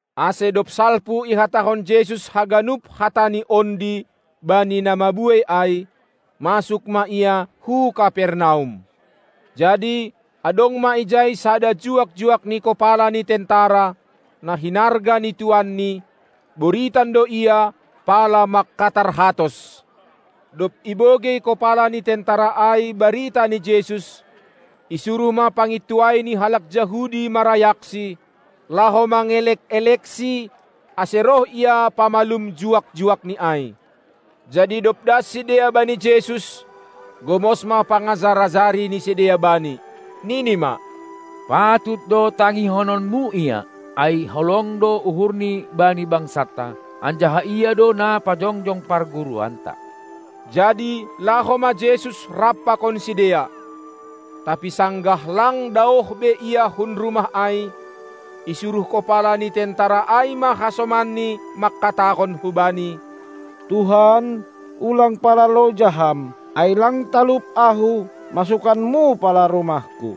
Ase dob salpu ihatahon Jesus haganup hataNi ondi bani na mabuei ai, masuk ma Ia hu Kapernaum. Jadi adong ma ijai sada juak-juak ni kopala ni tentara, na hinarga ni tuanni, boritan do ia, pala mangkatarhatos. Dob ibogei kopala ni tentara ai barita ni Jesus, isuruh ma pangintuai ni halak Jahudi marayakSi, laho mangelek-elekSi, ase roh Ia pamalum juak-juakni ai. Jadi dob das sidea bani Jesus, gomos ma pangajar-ajari ni sidea Bani, nini ma: Patut do tangihononMu ia. Ai holong do uhurni bani bangsanta, anjaha ia do na pajongjong parguruanta. Jadi laho ma Jesus rap pakon sidea. Tapi sanggah lang daoh be Ia hun rumah ai, isuruh kopala ni tentara ai ma hasomanni mangkatahon hu Bani: Tuhan, ulang pala loja Ham! Ai lang talup ahu, masukanmu pala rumahku.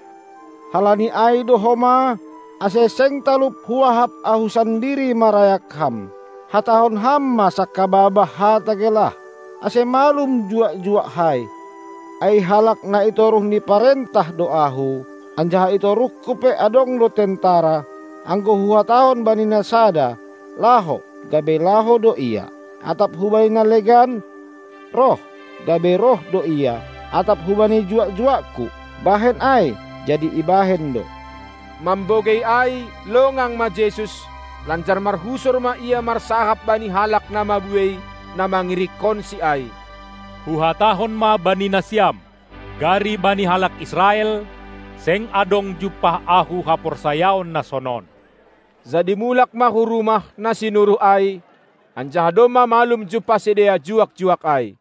Halani ai do homa, ase seng talup huahap ahu sandiri marayak Ham. Hatahon Ham ma sangkababah hata gelah, ase malum juak-juakkai. Ai halak na i toruh ni parentah do ahu, anjaha i toruhku pe adong do tentara. Anggo huhatahon bani na sada: Laho! gabe laho do ia. Atap hubani na legan: Roh! gabe roh do ia. Atap hubani juak-juakku: Bahen ai! jadi ibahen do. Mambogei ai longang ma Jesus, lanjar marhusor ma Ia marsahap bani halak na mabuei, na mangirikkonSi ai: Huhatahon ma bani nasiam: Gari bani halak Israel, seng adong jumpah Ahu haporsayaon na sonon. Jadi mulak ma hu rumah na sinuruh ai, anjaha domma malum jumpah sidea juak-juak ai.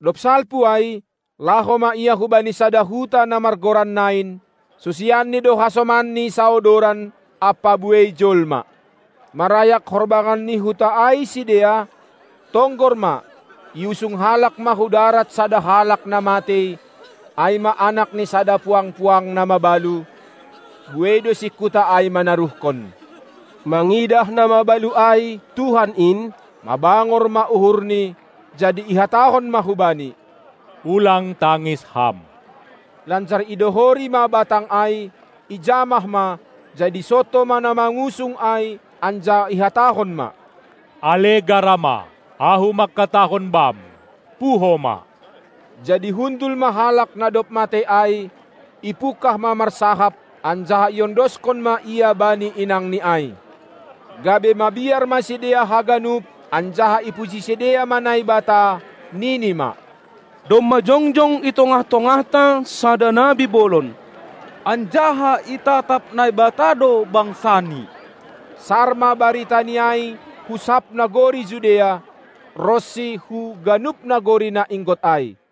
Dob salpu ai, laho ma Ia hubani sada huta na margoran Nain; susianNi do hasomanNi saodoran ampa buei jolma. Marayak horbangan ni huta ai sidea, tonggor ma, iusung halak ma hu darat sada halak na matei, ai ma anak ni sada puang-puang na mabalu; buei do singkuta ai manaruhkon. Mangidah na mabalu ai Tuhan in, mabangor ma uhurNi, jadi ihatahon ma hubani: Ulang tangis ham! Lanjar idohori ma batang ai, ijamah ma, jadi sonto ma na mangusung ai, anjaha ihatahon ma: Ale garama, Ahu mangkatahon bam, puho ma! Jadi hundul ma halak na dob matei ai, ipungkah ma marsahap, anjaha iondoskon ma ia bani inangni ai. Gabe mabiar ma sidea haganup, anjaha ipuji sidea ma Naibata, nini ma: Domma jongjong i tongah-tongahta sada nabi bolon, anjaha itatap Naibata do bangsaNi. Sar ma baritani ai hu sab nagori Judea, ronsi hu ganup nagori na inggot ai.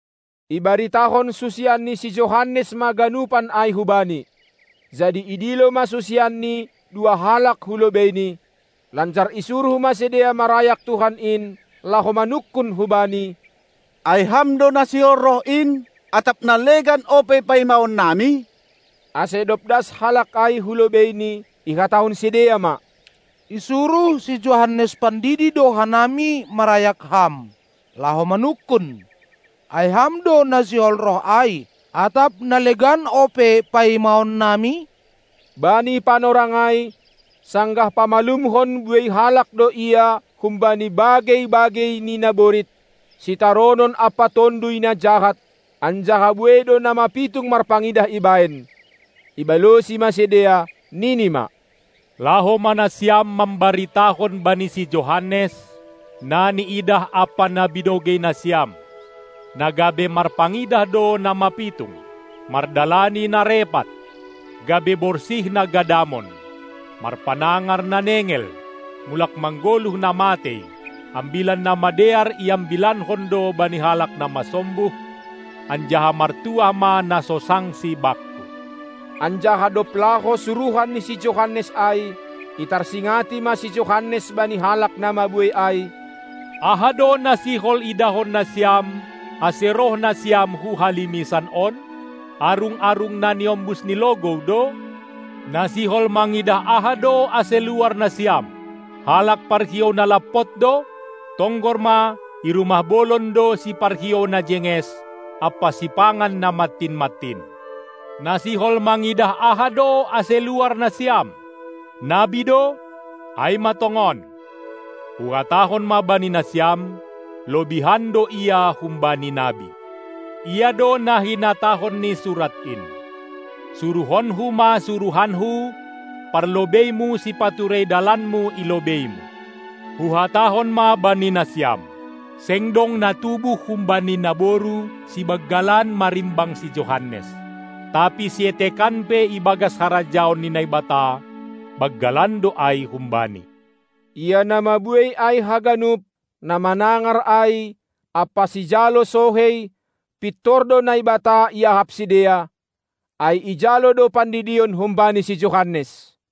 Ibaritahon susian ni si Johannes ma ganupan ai hubani. Jadi idilo ma susianni dua halak hu lobeini, lanjar isuruh ma sidea marayak Tuhan in, laho manungkun hu Bani: Ai Ham do na sihol roh in, atap na legan ope paimaon nami? Ase dob das halak ai hu lobeiNi, ihatahon sidea ma: Isuruh si Johannes pandidi do hanami marayak Ham, laho manungkun: Ai Ham do na sihol roh ai, atap na legan ope paimaon nami? Bani panorang ai, sanggah pamalumhon buei halak do Ia humbani bagei-bagei ni naborit, sitaronon ampa tonduy na jahat, anjaha buei do na mapitung marpangidah ibahen. Ibalosi ma sidea nini ma: Laho ma nasiam mambaritahon bani si Johannes na niidah ampa na binogei nasiam: Na gabe marpangidah do na mapitung, mardalani na repat, gabe borsih na gadamon, marpanangar na nengel, mulak manggoluh na matei, ambilan na madear iambilankon do bani halak na masombuh, anjaha martuah ma na so sangsi Bakku! Anjaha dob laho suruhan ni si Johannes ai, itarsingati ma si Johannes bani halak na mabuei ai: Aha do na sihol idahon nasiam, ase roh nasiam hu halimisan on? Arung-arung na niombus ni logou do? Na sihol mangidah aha do, ase luar nasiam? Halak parhiou na lampot do? Tonggor ma, i rumah bolon do siparhiou na jenges ampa sipangan na mantin-mantin. Na sihol mangidah aha do, ase luar nasiam? Nabi do? Ai ma tongon. Huhatahon ma bani nasiam: Lobihan do Ia humbani nabi. Ia do na hinatahon ni surat in: SuruhonKu ma suruhanKu, parlobeimu, sipaturei dalanMu i lobeiMu! Huhatahon ma bani nasiam: Seng dong na tubuh humbani naboru sibanggalan marimbang si Johannes; tapi sietekan pe ibagas harajaon ni Naibata, banggalan do ai humbani. Ia na mabuei ai haganup, na manangar ai, ampa sijalo sohei, pintor do Naibata iahap sidea, ai ijalo do pandidion humbani si Johannes.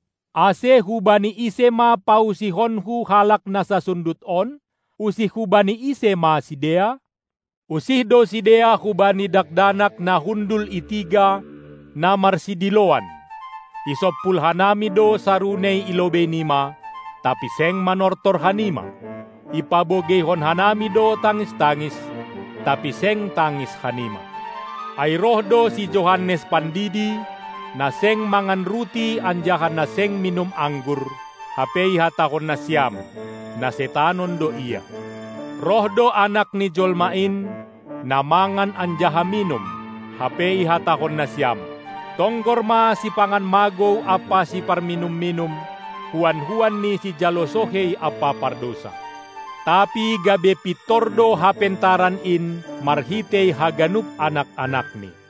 Ase hubani ise ma pausihonKu halak na sasundut on? Usih hubani ise ma sidea? Usih do sidea hubani dakdanak na hundul i tiga, na marsidiloan: Isompul hanami do sarunei i lobei nima, tapi seng manortor hanima, ipabogeihon hanami do tangis-tangis, tapi seng tangis hanima. Ai roh do si Johannes pandidi, na seng mangan ruti anjaha na seng minum anggur, hape ihatahon nasiam: Na setanon do ia. Roh do Anak ni jolma in, na mangan anjaha minum, hape ihatahon nasiam: Tonggor ma sipangan magou ampa siparminum-minum, huan-huan ni sijalo sohei ampa pardousa. Tapi gabe pintor do Hapentaran in marhitei haganup anak-anakni.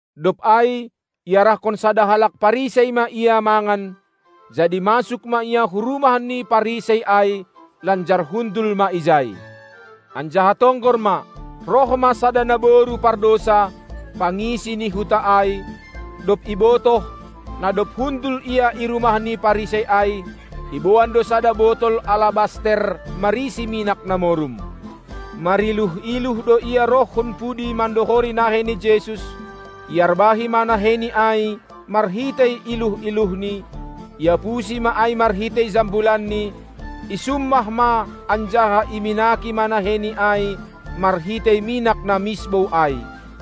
Dob ai iarahkon sada halak Parisei ma Ia mangan, jadi masuk ma Ia hu rumah ni Parisei ai, lanjar hundul ma ijai. Anjaha tonggor ma, roh ma sada naboru pardousa, pangisi ni huta ai, dob ibotoh, na dob hundul Ia i rumah ni Parisei ai; iboan do sada botol alabaster marisi minak na morum. Mariluh-iluh do ia roh hun pudi mandohori nahei ni Jesus; iarbahi ma naheiNi ai marhitei iluh-iluhni, iapusi ma ai marhitei jambulanni, isummah ma anjaha iminaki ma naheiNi ai marhitei minak na misbou ai.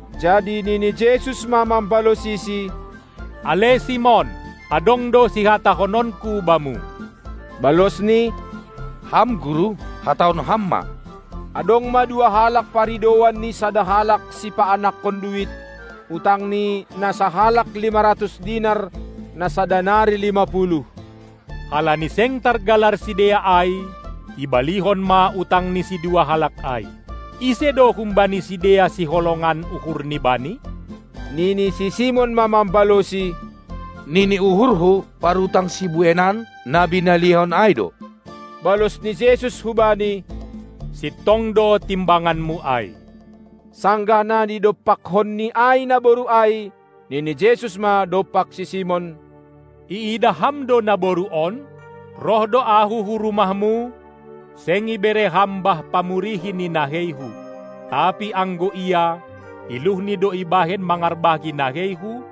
Jadi nini Jesus ma mambalosisi: Ale Simon, adong do sihatahononKu bamu. Balosni: Ham Guru, hatahon Ham ma! Adong ma dua halak paridouan ni sada halak sipaanakkon duit; utang ni na sahalak lima ratus dinar, na sada nari lima puluh. Halani seng targalar sidea ai, ibalihon ma utang ni sidua halak ai. Ise do humbani sidea siholongan uhurni bani? Nini si Simon ma mambalosi: Nini uhurhu, parutang sibueinan, na binalihon ai do. Balos ni Jesus hubani: Sintong do timbanganmu ai. Sanggah na nidompakkonni ai naboru ai, nini Jesus ma dompak si Simon: Iidah ham do naboru on? Roh do Ahu hu rumahmu, seng ibere ham bah pamurihi ni naheiHu, tapi anggo ia, iluhni do ibahen mangarbahi naheiHu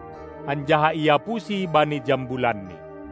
anjaha iapusi bani jambulanni.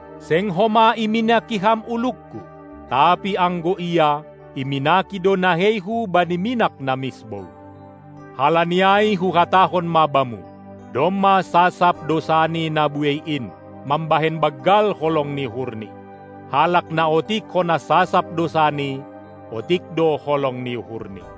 Seng homa iminaki ham ulungKu, tapi anggo ia, iminaki do naheiHu bani minak na misbou. Halani ai Huhatahon ma bamu: Domma sasap dousani na buei in, mambahen banggal holong ni uhurni. Halak na otik hona sasap dousani, otik do holong ni uhurni.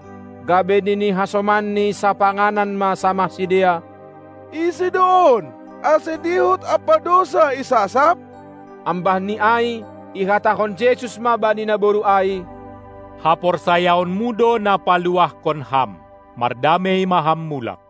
Gabe nini hasomanni sapanganan ma samah sidea: Ise do on, ase dihut ampa dousa isasap? Ambahni ai ihatahon Jesus ma bani naboru ai: Haporsayaonmu do na paluahkon ham. Mardamei ma ham mulak.